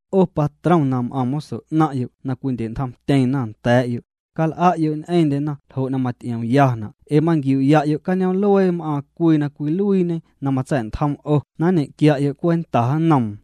'O patrom na m'aⁿ moso 'naⁿ'yo' na cwindye'ntjomtyeⁿna nda̱a̱'yo', cal'a'yo' ñ'eⁿndyena ljo' na maty'iomyana' ee manquiu'ya'yo' cañoom'luee m'aaⁿ cwii na cwiluiiñe na matsa̱'ntjom 'o na nñequia'yo' cwenta nnoom.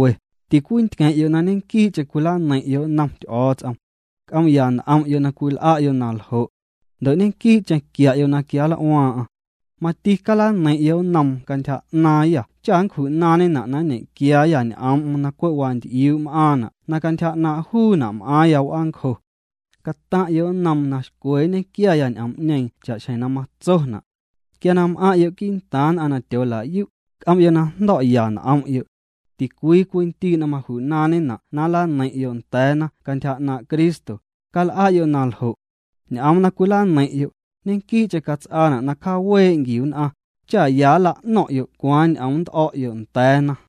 Ticwintqueⁿ'yo' na ñequii'cheⁿ cwilaneiⁿ'yo' nnom Ty'o̱o̱ts'om. C'oom'ya n'om'yo' na cwil'a'yo' na ljo'. Ndo' ñequii'cheⁿ quia'yo' na quianl'uaaⁿ'aⁿ. Mati calaneiⁿ'yo' nnoom cantyja 'naaⁿyâ cha' nncju'naaⁿñena' na nñequiaayâ ñ'oom'm na cwe' wanty'iu m'aaⁿna' na cantyja 'naaⁿ' juuna' m'aaⁿya w'aancjo. Cataⁿ'yo' nnoom na xcwe nñequiaya ñ'oom'ñeeⁿ cha'xjeⁿ na matsona'. Quia na m'aⁿ'yo' quii'ntaaⁿ nn'aⁿ na tyoola'yu', c'om'yo' na jndo̱'ya n'om'yo'. Ticwii cwii ndii' na maju'naaⁿñena' na nlaneiⁿ'yo' nda̱a̱na cantyja 'naaⁿ' Cristo, cal'a'yo' na ljo'. Ñ'oom na cwilaneiⁿ'yo', ñequii'cheⁿ cats'aana' na cjawee' nquiu nn'aⁿ, cha ya nla'no̱ⁿ'yo' cwaaⁿ ñ'oom nnt'o̱'yo' nda̱a̱na.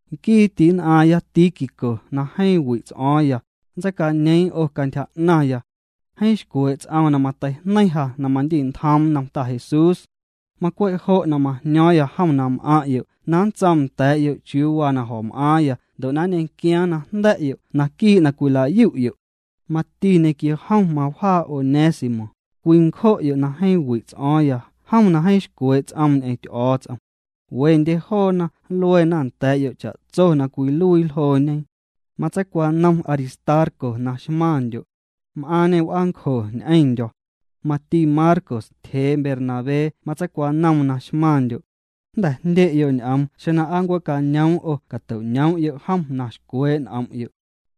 Nquii ti'nn'aaⁿya Tíquico na jeeⁿ wi' ts'o̱o̱ⁿya, nntseicañeeⁿ 'o cantyja 'naⁿya. Jeeⁿ xcwee' ts'oom na mateijneiⁿ ja na mandi'ntjoom nnom Ta Jesús. Macwe' jo' majño̱o̱ⁿya jom na m'aⁿ'yo' na nntsoom nda̱a̱'yo' chiuu waa na jo̱m'aaⁿya ndo' na nñequiaaⁿ na jnda̱'yo' naquii' na cwilayu'yo'. Mati ñequio jom mawjaa Onésimo, cwii ncjo'yo' na jeeⁿ wi' ts'o̱o̱ⁿya jom na jeeⁿ xcwee' ts'oom ñ'eⁿ Ty'o̱o̱ts'om. Wendye joona nluena nda̱a̱'yo' cha'tso na cwiluii ljooñe. Matseicwanom Aristarco na xmaⁿndyo'. M'aaⁿñê w'aancjo ñ'eⁿndyo̱. Mati Marcos tyjee Bernabé matseicwanoom na xmaⁿndyo'. Jnda̱ jndye'yo' ñ'oom xeⁿ na aa nncue'cañoom 'o cato'ñoom'yo' jom na xcwee' n'om'yo'.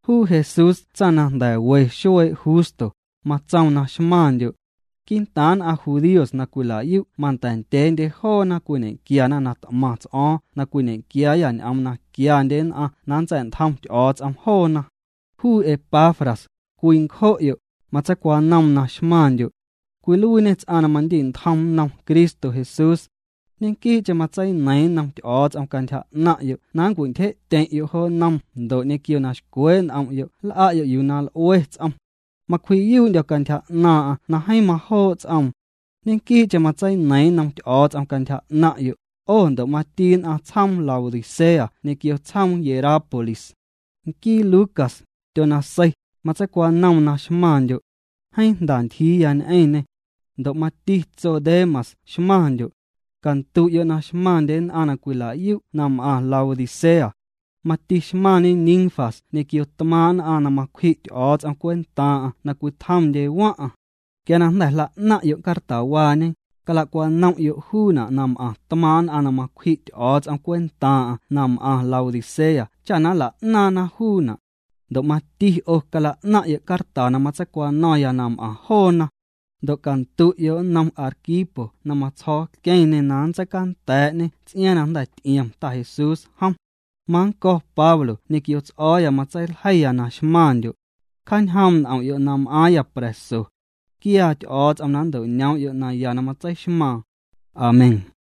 Juu Jesús tsaⁿ na jnda̱ we xuee' Justo, matsoom na xmaⁿndyo'. Quii'ntaaⁿ nn'aⁿ judíos na cwila'yu' manda̱ ndyeendye joona cwiñequiana na t'maⁿ ts'o̱o̱ⁿ na cwiñequiaayâ ñ'oom na quiandye nn'aⁿ na nntsa̱'ntjom Ty'o̱o̱ts'om joona. Juu Epafras, cwii ncjo'yo', matseicwanoom na xmaⁿndyo'. Cwiluiiñê ts'aⁿ na mandi'ntjom nnom Cristo Jesús. Ñequii'cheⁿ matseineiiⁿ nnom Ty'o̱o̱ts'om cantyja 'naⁿ'yo' na nncwintyje'tyeⁿ'yo' jo nnom ndo' ñequio na xcwee' n'om'yo' na nl'a'yo' yuu na l'ue ts'om. Macwji'yuu'ndyo̱ cantyja 'naaⁿ'aⁿ na jeeⁿ majoo' ts'oom, ñequii'cheⁿ matseineiiⁿ nnom Ty'o̱o̱ts'om cantyja 'naⁿ'yo', 'o ndo' mati nn'aⁿ tsjoom Laodicea ñequio tsjoom Hierápolis. Nquii Lucas, tyonasei, matseicwanoom na xmaⁿndyo'. Jeeⁿ jnda ntyjiiya ñ'eⁿñê. Ndo' mati tso Demas xmaⁿndyo'. Candu'yo' na xmaⁿndye nn'aⁿ na cwila'yu' na m'aⁿ Laodicea. Mati xmaⁿñe Ninfas ñequio tmaaⁿ' nn'aⁿ na macwji' Ty'o̱o̱ts'om cwentaaⁿ'aⁿ na cwitjomndye waⁿ'aⁿ. Quia na jnda̱ jla'naⁿ'yo' cartawaañe, cala'cwanom'yo' juuna' na m'aⁿ tmaaⁿ' nn'aⁿ na macwji' Ty'o̱o̱ts'om cwentaaⁿ'aⁿ na m'aⁿ Laodicea cha na nla'naaⁿna juuna', ndo' mati 'o cala'naⁿ'yo' carta na matseicwano̱ⁿya na m'aⁿ joona. Ndo' candu'yo' nnom Arquipo na matsjo̱o̱ queⁿñê na nntseicanda̱a̱'ñê ts'iaaⁿ na jnda̱ ty'iom Ta Jesús jom. Mannco̱ Pablo ñequio ts'o̱o̱ya matseiljeiya na xmaⁿndyo'. Cjaañjoom' n'om'yo' na m'aaⁿya pra̱so. Quiaa Ty'o̱o̱ts'om na nto'noom'yo' naya na matseixmaaⁿ. Amén.